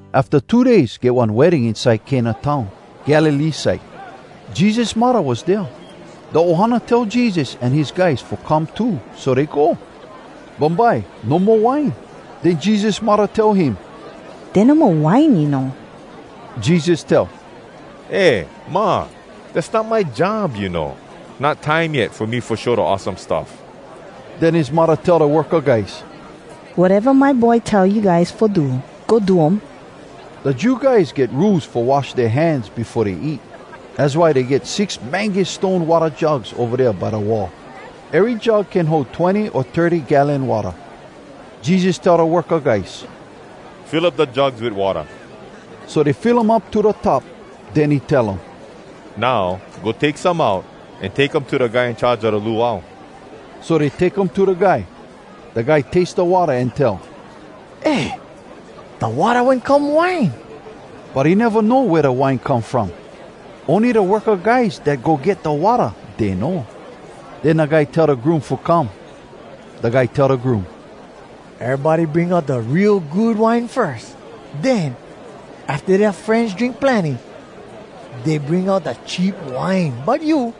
Afta two days, get one wedding inside Cana town, Galilee side. Jesus muddah was dea. Da ohana tell Jesus an his guys fo come too, so dey go. Bumbye no mo wine. Den Jesus muddah tell him, “Dey no mo wine, you know.” Jesus tell, “Eh, Ma! Dass not my job, you know. Not time yet fo me fo show da awesome stuff.” Den his muddah tell da worka guys, “Wateva my boy tell you guys fo do, go do um!” Da Jew guys get Rules fo wash dea hands befo dey eat. Az why dey get six mangus stone watta jugs ova dea by da wall. Ery jug can hold twenny o thirty gallon watta. Jesus tell da worka guys, “Fill up da jugs wit watta.” So dey fill um up to da top. Den he tell um, “Now, go take some out, an take um to da guy in charge a da luau.” So dey take um to da guy. Da guy taste da watta an tell, “Eh, da watta wen come wine!” But he neva know wea da wine come from. Ony da worka guys dat go get da watta, dey know. Den da guy tell da groom fo come. Da guy tell da groom, “Erybody bring out da real good wine firs. Den, afta dea frenz drink plenny, dey bring out da cheap wine. But you,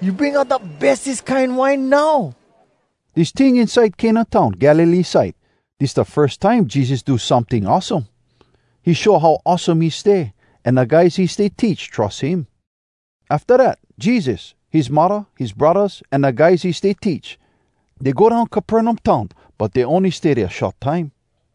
you bring out da bestes kine wine now!” Dis ting inside Cana town, Galilee side, dis da firs time Jesus do someting awesome. He show how awesome he stay, an da guys he stay teach trus him. Afta dat, Jesus, his muddah, his braddahs, an da guys he stay teach, dey go down Capernaum town. But dey ony stay dea short time.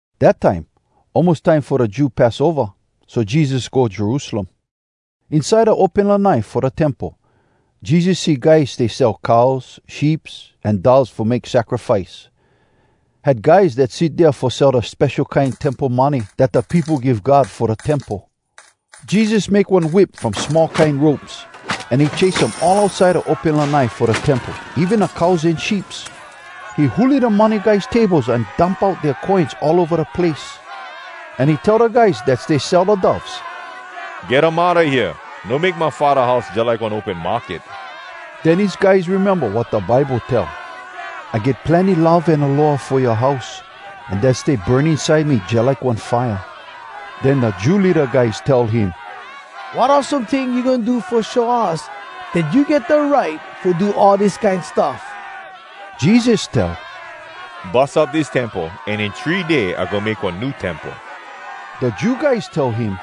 Dat time, almos time fo da Jew Passova. So Jesus go Jerusalem. Inside da open lanai fo da Temple, Jesus see guys stay sell cows, sheeps, an doves fo make sacrifice. Had guys dat sit dea fo sell da spesho kine temple money dat da peopo give God fo da Temple. Jesus make one whip from small kine ropes, an he chase um all outside da open lanai fo da Temple, even da cows an sheeps. He huli da money guys tables an dump dea coins all ova da place. An he tell da guys dat stay sell da doves, “Get um outa hea! No make my Faddah house jalike one open market!” Den his guys rememba wat da Bible tell, “I get plenny love an aloha fo yoa house, an dat stay burn inside me jalike one fire.” Den da Jew leada guys tell him, “Wat awesome ting you goin do fo show us dat you get da right fo do all dis kine stuff?” Jesus tell, “Bus up dis Temple, an in three day I goin make one new Temple.” Da Jew guys tell him,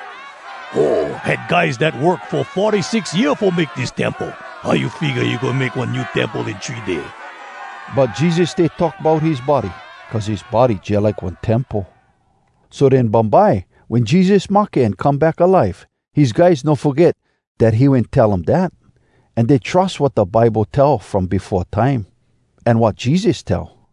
“Ho! Had guys dat work fo forty six year fo make dis Temple! How you figga you goin make one new temple in three day?” But Jesus stay talk bout his body, cuz his body jalike one temple. So den bumbye, wen Jesus mahke an come back alive, his guys no foget dat he wen tell um dat, an dey trus wat da Bible tell from befo time, an wat Jesus tell.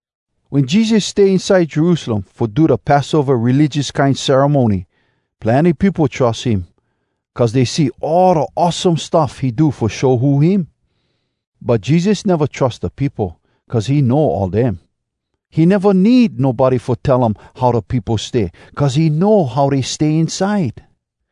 Wen Jesus stay inside Jerusalem fo da Passova religious kine ceremony, plenny peopo trus him, cuz dey see all da awesome stuff he do fo show who him. But Jesus neva trus da peopo, cuz he know all dem. He neva need nobody fo tell um how da peopo stay, cuz he know how dey stay inside.